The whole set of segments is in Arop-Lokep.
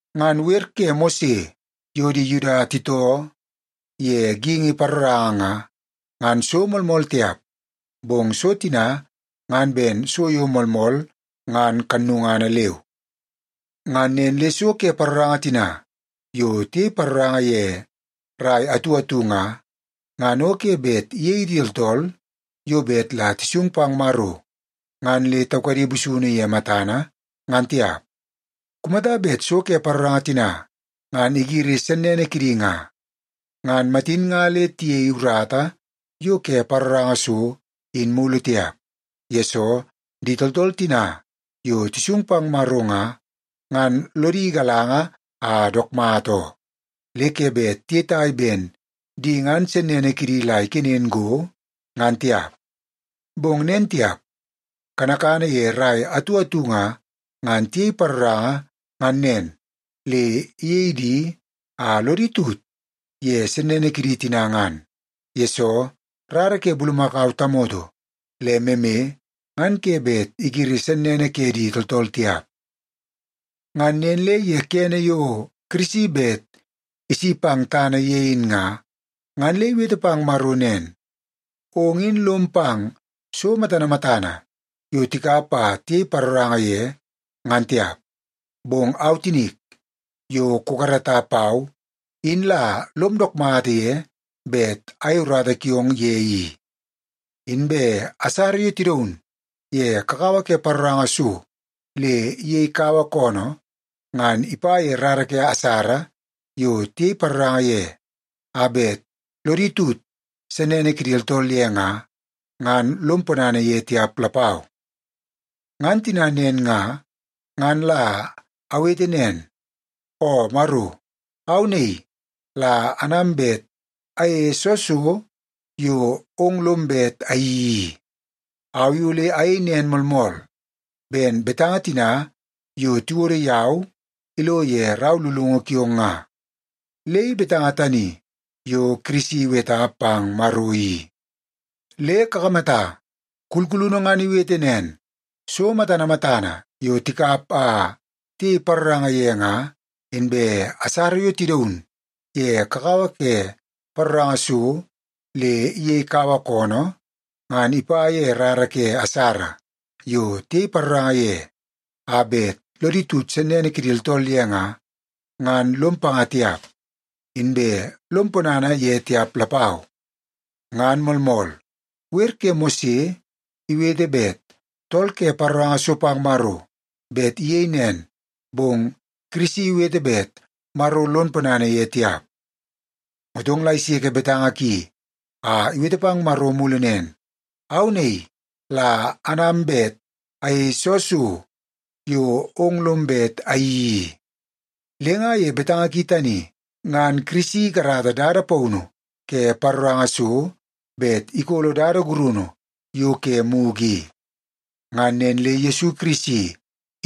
Ngan wer ke Mose yo di Yuda titoo ye geingi paroranga nga, ngan so moolmool tiap, bong so tina ngan ben so yo moolmool ngan kannungana leu. Ngan nen le so ke paroranga tina yo tiyei paroranga ye rai atu atu nga, ngan o ke bet iyei di tooltool yo bet la tisung pang Maro ngan le taukadi busunu ye matana, ngan tiap. Kumata bet so ke paroranga tina ngan igiri sennene kidi nga, ngan matin nga le tiyei urata yo ke paroranga so in mulu tiap, yesoo di tooltool tina yo tisung pang Maro nga, ngan lodi igalanga a dook mata oo, le ke bet tiyetai ben di ngan sennene kidi la ikenen go, ngan tiap. Bong nen tiap. Kanakana ye rai atu atu nga, ngan tiyei paroranga ngan nen le iyei di a lodi tut ye sennene kidi tina ngan. Yesoo, rara ke bulumakau tamoto le meme ngan ke bet igiri sennene ke di tooltool tiap. Ngan nen le ye kene yo Kirisi bet isi pang tana ye in nga, ngan le iwete pang Maro nen, “Ong in lom pang so matana matana yo tikap a tiyei paroranga ye ngan tiap, bong au tinik, yo kukarata pau, in la lom dook mata ye bet ayei urata kiong ye i. Inbe asara yo tidaun ye kakawa ke paroranga so le iyei kaua koonoo, ngan ipa ye rara ke asara yo tiyei paroranga ye, a bet lodi tut sennene kidi tooltool ye nga, ngan lom ponana ye tiap lapau. Ngan tina nen nga, ngan la awete nen, ‘O Maro! Au naii la anam bet ayeie soo so yo ong lom bet ayeii i. Au i ole ayei nen moolmool, ben betanga tina yo tiwodo yau ilo ye rau lulungu kiong nga.’” Le i betanga tani yo Kirisi iweta pang Maro i. Le kakamata, kulkulunu ngan iwete nen, “So matana matana yo tikap a tiyei paroranga ye nga, inbe asara yo tidaun ye kakawa ke paroranga so le iyei kaua koonoo, ngan ipa ye rara ke asara yo tiyei paroranga ye a bet lodi tut sennene kidi tooltool ye nga, ngan lom panga tiap, inbe lom ponana ye tiap lapau.” Ngan moolmool, wer ke Mose iwete bet tool ke paroranga so pang Maro bet iyei nen, bong Kirisi iwete bet Maro lon ponana ye tiap. Motong la iseke betanga ki a iwete pang Maro mulu nen, “Au naii la anam bet ayeie soo so yo ong lom bet ayeii i.” Le nga ye betanga ki tani, ngan Kirisi ikarata dada paunu ke paroranga so bet ikolo dada gurunu yo ke mugu i. Ngan nen le Yesu Kirisi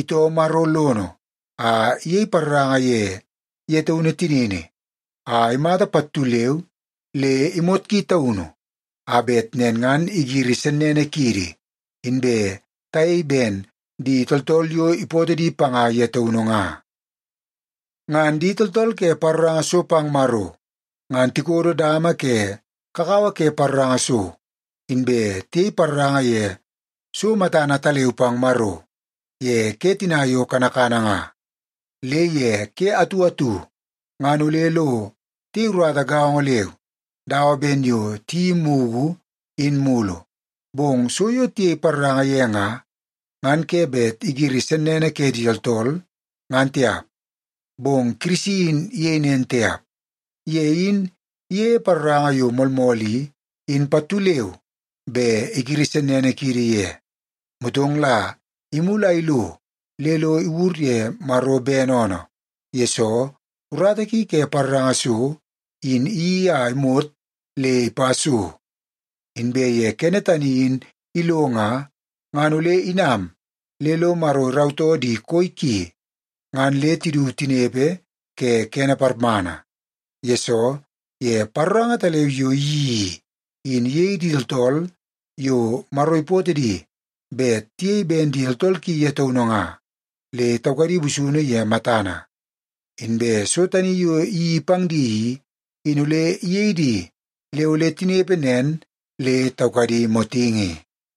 itoo Maro lono a iyei paroranga ye ye taunu tinini a imata pattu leu le imot ki taunu, a bet nen ngan igiri sennene kiidi, inbe tayei ben di tooltool yo ipootoo di panga ye taunu nga. Ngan di tooltool ke paroranga so pang Maro, ngan tikodo dama ke kakawa ke paroranga so, inbe tiyei paroranga ye so matana ataleu pang Maro ye ke tina yo kanakana nga. Le ye ke atu atu ngan ole lo tiyei urata gaongo leu dawa ben yo tiyeii mugu in mulu, bong so yo tiyei paroranga ye nga, ngan ke bet igiri sennene ke di tooltool, ngan tiap. Bong Kirisi in iyei nen tiap. Ye in iyeie paroranga yo moolmool i, in pattu leu be igiri sennene kiidi ye. Motong la imulu a ilo le lo iwur ye Maro bene oonoo, yesoo urata ki ke paroranga so, in iyeii a imot le ipa so. Inbe ye kene tani in ilo nga, ngan ole inam le lo Maro irautoo di koi ki ngan le tidu tinepe ke kene parmana. Yesoo, ye paroranga ataleu yo iyeii i, in iyei di tooltool yo Maro ipootoo di bet tiyei ben di tooltool ki ye taunu nga, le taukadi busunu ye matana. Inbe so tani yo iyeii pang di i, in ole iyei di le ole tinepe nen le taukadi motingi.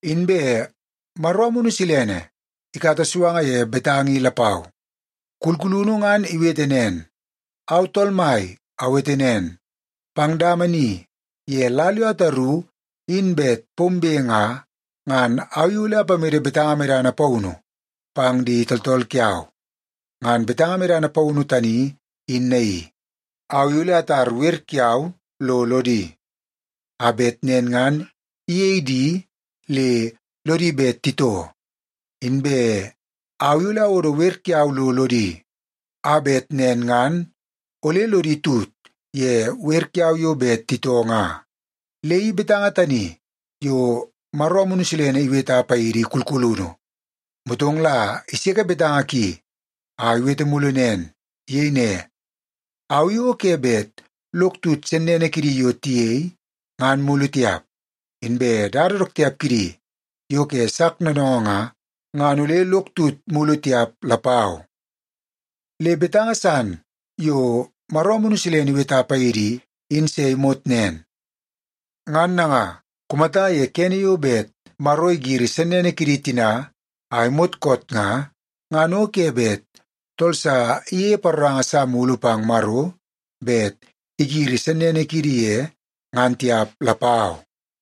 Inbe Maro Amunu Silene ikata suanga ye betanga i lapau. Kulkulunu ngan iwete nen, “Au Tool Mai awete nen, pang dama ni ye lal yo ataru in bet pombe nga, ngan au i ole ipamede betanga medana paunu pang di tooltool kiau. Ngan betanga medana paunu tani in naii: Au i ole atar wer kiau lo lodi, a bet nen ngan iyei di le lodi bet titoo, inbe au i ole awodo wer kiau lo lodi, a bet nen ngan ole lodi tut ye wer kiau yo bet titoo nga.” Le i betanga tani yo Maro Amunu Silene iweta paidi kulkulunu, motong la iseke betanga ki a iwete mulu nen. Iyei ne, “Au i o ke bet lok tut sennene kidi yo tiyei, ngan mulu tiap. Inbe dada dook tiap kidi yo ke sak noonoongoo nga, ngan ole lok tut mulu tiap lapau.” Le betanga san yo Maro Amunu Silene iweta paidi i, in se imot nen. Ngan nanga, kumata ye kene yo bet Maro igiri sennene kidi tina a imot koot nga, ngan o ke bet tool sa iyeie paroranga sa mulu pang Maro bet igiri sennene kidi ye, ngan tiap lapau.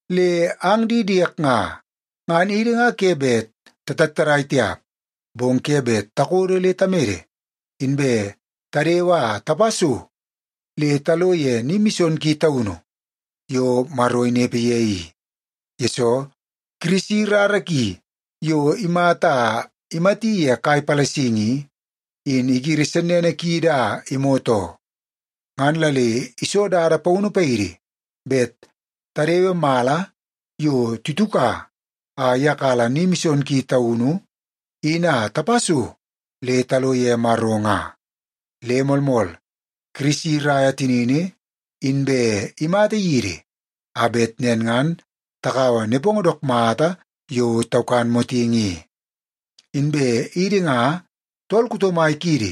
Le ang di diek nga, ngan idi nga ke bet tatattadai tiap, bong ke bet takodo le tamede, inbe tadewe a tapa so le talo ye Ni Mison Ki Taunu yo Maro inepe ye i. Yesoo, Kirisi rara ki yo imata a imati ye kai palasingi i, in igiri sennene kiidi a imot oo. Ngan la le iso dada paunu paidi bet tadewe mala yo tituka a iyakala Ni Mison Ki Taunu in a tapa so le talo ye Maro nga. Le moolmool, Kirisi iraia tinini inbe imata yidi, a bet nen ngan takaua nepongo dook mata yo taukan motingi i. Inbe idi nga, tool kuto mai kiidi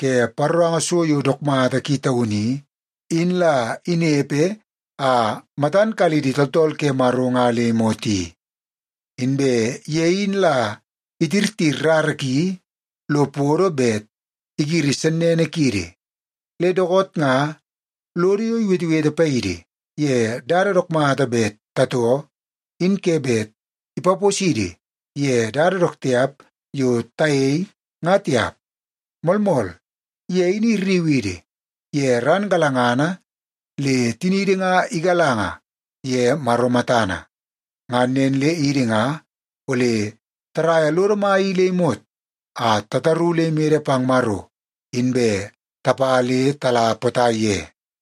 ke paroranga so yo dook mata ki taunu i, in la inepe a matan kala idi tooltool ke Maro nga le imot i. Inbe ye in la itirtir rara ki lo podo bet igiri sennene kiidi, le dookoot nga lodo yo iwetewete paidi ye dada dook mata bet tatoo, in ke bet ipaposidi ye dada dook tiap yo tayei nga tiap. Moolmool, ye in irriu idi ye ran galangana le tiniidi nga igalanga ye Maro matana. Ngan nen le idi nga ole taraia lodo mai i le imot a tataru le imede pang Maro, inbe tapa le tala potai ye.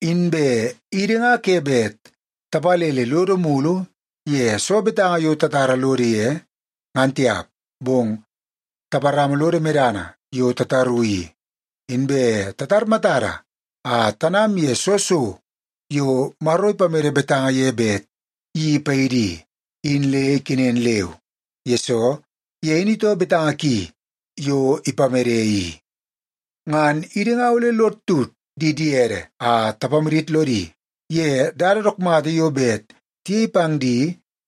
Inbe idi nga ke bet tapalele lodo mulu ye soo betanga yo tatara lodo ye, ngan tiap, bong taparama lodo medana yo tataru i. Inbe tatar matada a tanam ye soo so yo Maro ipamede betanga ye bet iyeii paidi i, in le ikenen leu, yesoo ye in itoo betanga ki yo ipamede i. Ngan idi nga ole lod tut di diede a tapamadit lodi ye dada dook mata yo bet tiyei pang di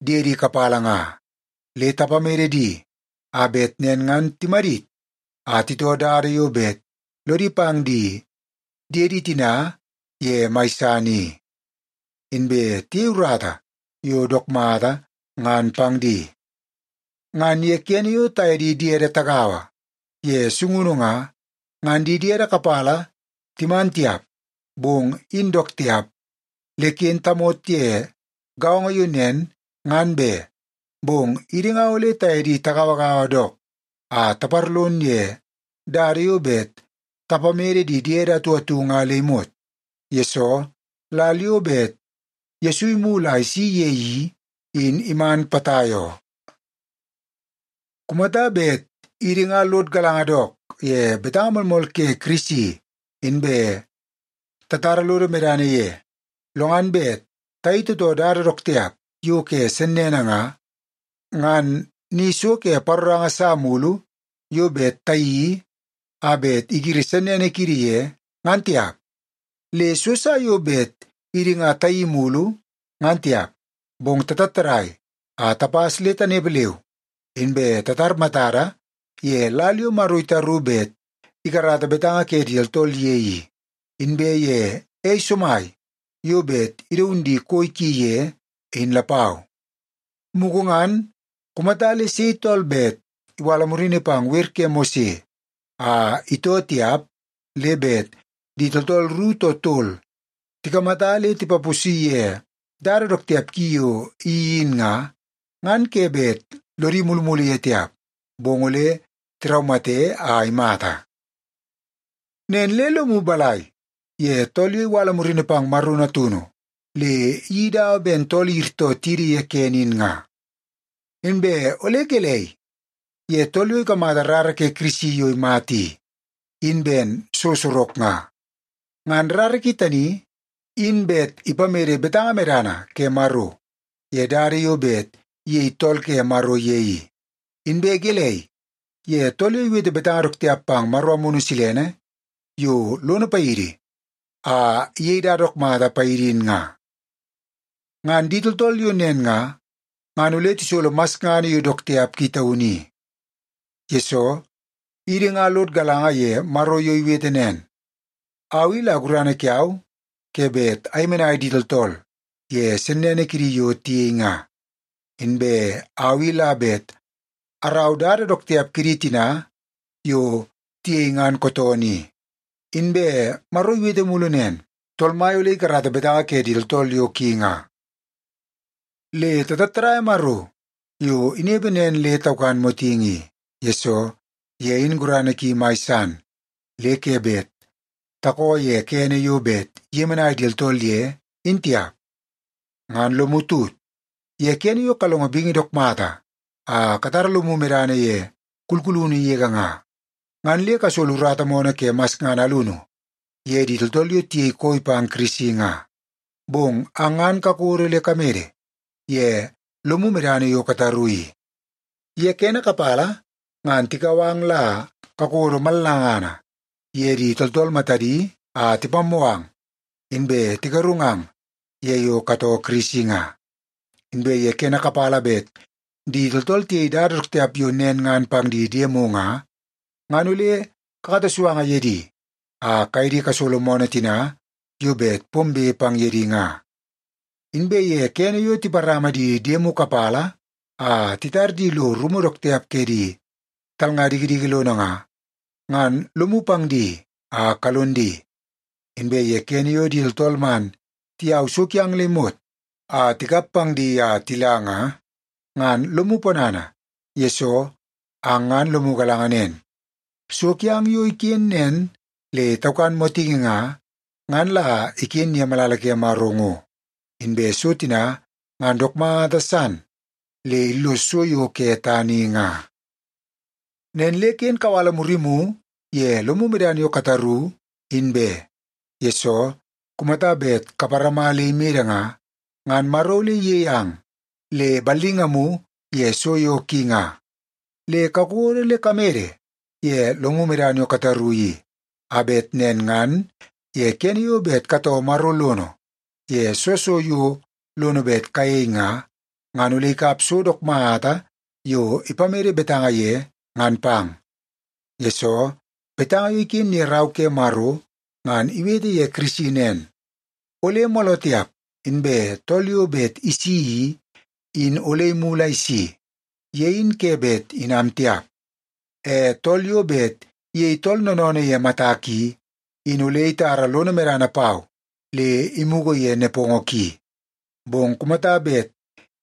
diedi kapala nga. Le tapamede di a bet nen ngan timadit a titoo dada yo bet lodi pang di diede tina ye mai san i, inbe tiyei urata yo dook mata ngan pang di. Ngan ye kene yo taye di diede tagaua ye sungunu nga, ngan di diede kapala timan tiap, bong in dook tiap, le ken tamot ye gaongo yo nen, ngan be. Bong idi nga ole taye di tagauagaua dook a taparlon ye dada yo bet tapamede di diede atu atu nga le imot, yesoo lal yo bet Yesu imulu a isi ye i, in iman potai oo. Kumata bet idi nga lod galanga dook ye betanga moolmool ke Kirisi inbe tatara lodo medana ye, lo ngan bet tayei tootoo dada dook tiap yo ke sennene nga, ngan ni so ke paroranga sa mulu yo bet tayeii a bet igiri sennene kiidi ye, ngan tiap. Le so sa yo bet idi nga tayeii mulu ngan tiap, bong tatattadai a tapas le tanepe leu, inbe tatar matada ye lal yo Maro itaru bet ikarata betanga ke di tooltool ye i, inbe ye ei somai yo bet idaun di koi ki ye, in lapau. Mugu ngan, kumata le sei tool bet iwala murini pang wer ke Mose a itoo tiap, le bet di tooltool ru too tol tikamata le tipaposi ye dada dook tiap ki yo iyeii in nga, ngan ke bet lodi mulumulu ye tiap, bong ole tiraumate a imata. Nen le lomu balai ye tool yo iwala murini pang Maro Natunu le iyeii dawa ben tool iyirtoo tidi ye kene in nga? Inbe ole gelei ye tool yo ikamata rara ke Kirisi yo imata i, in ben so sorok nga? Ngan rara ki tani, in bet ipamede betanga medana ke Maro ye dada yo bet iyei tool ke Maro ye i. Inbe gelei ye tool yo iwete betanga dook tiap pang Maro Amunu Silene yo lono paidi a iyei dada dook mata paidi in nga? Ngan di tooltool yo nen nga, ngan ole tisolo masngana yo dook tiap ki taunu i. Yesoo, idi nga lod galanga ye Maro yo iwete nen, “Au i la gurana kiau ke bet ayemenai di tooltool ye sennene kidi yo tiyei nga. Inbe au i la bet arau dada dook tiap kidi tina yo tiyei ngan kootoonoo i.” Inbe Maro iwete mulu nen, “Tool Mai ole ikarata betanga ke di tooltool yo ki nga.” Le tatattadaia Maro yo inepe nen le taukan motingi i, yesoo ye in gurana ki mai san le ke bet takoo ye kene yo bet iyemenai di tooltool ye, in tiap. Ngan lomu tut ye kene yo kalongo bingi dook mata a katara lomu medana ye kulkulunu yege nga, ngan le kasolo urata moonoo ke masngana alunu ye di tooltool yo tiyei koi pang Kirisi nga. Bong ang ngan kakodo le kamede ye lomu medana yo kataru i. Ye kene kapala ngan tikau ang la kakodo mallangana ye di tooltool matadi a tipammoo ang, inbe tigarungang ye yo katoo Kirisi nga. Inbe ye kene kapala bet di tooltool tiyei dada dook tiap yo nen ngan pang di diemu nga, ngan ole kakata suanga ye di a kaye di kasolo moonoo tina yo bet pombe pang ye di nga. Inbe ye kene yo tiparama di diemu kapala a titar di lo rumu dook tiap ke di talnga dikidiki lono nga, ngan lomu pang di a kalon di. Inbe ye kene yo di tooltool man tiyau so kiang le imot a tikap pang di a tila nga, ngan lomu ponana, yesoo ang ngan lomu galanga nen, so kiang yo iken nen le taukan motingi nga, ngan la iken ye malala ke Maro ngo. Inbe so tina ngan dook mata san le illos so yo ke tana i nga. Nen le ken kawala murimu ye lomu medana yo kataru, in be, yesoo kumata bet kaparama le imede nga, ngan Maro ole iyei ang le ballingamu ye so yo ki nga. Le kakodo le kamede ye lomu medana yo kataru i, a bet nen ngan ye kene yo bet katoo Maro lono ye soo so yo lono bet kayei nga, ngan ole ikap so dook mata yo ipamede betanga ye ngan pang. Yesoo, betanga yo iken ye Rau ke Maro ngan iwete ye Kirisi nen, “Ole mooloo tiap inbe tool yo bet isi i, in ole imulu a isi. Ye in ke bet inam tiap. E tool yo bet iyei tool noonoonoo ye matak i, in ole itara lono medana pau le imugu ye nepongo ki. Bong kumata bet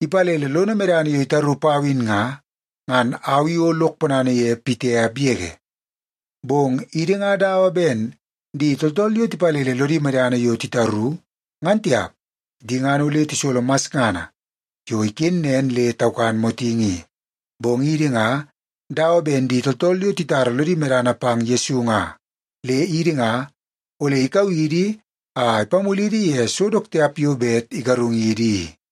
ipalele lono medana yo itaru pau in nga, ngan au i o lok ponana ye pitiap yege.” Bong idi nga dawa ben di tooltool yo tipalele lodi medana yo titaru, ngan tiap. Di ngan ole tisolo masngana yo iken nen le taukan motingi i. Bong idi nga dawa ben di tooltool yo titara lodi medana pang Yesu nga. Le idi nga, ole ikau idi a ipamulidi ye so dook tiap yo bet igarungidi i.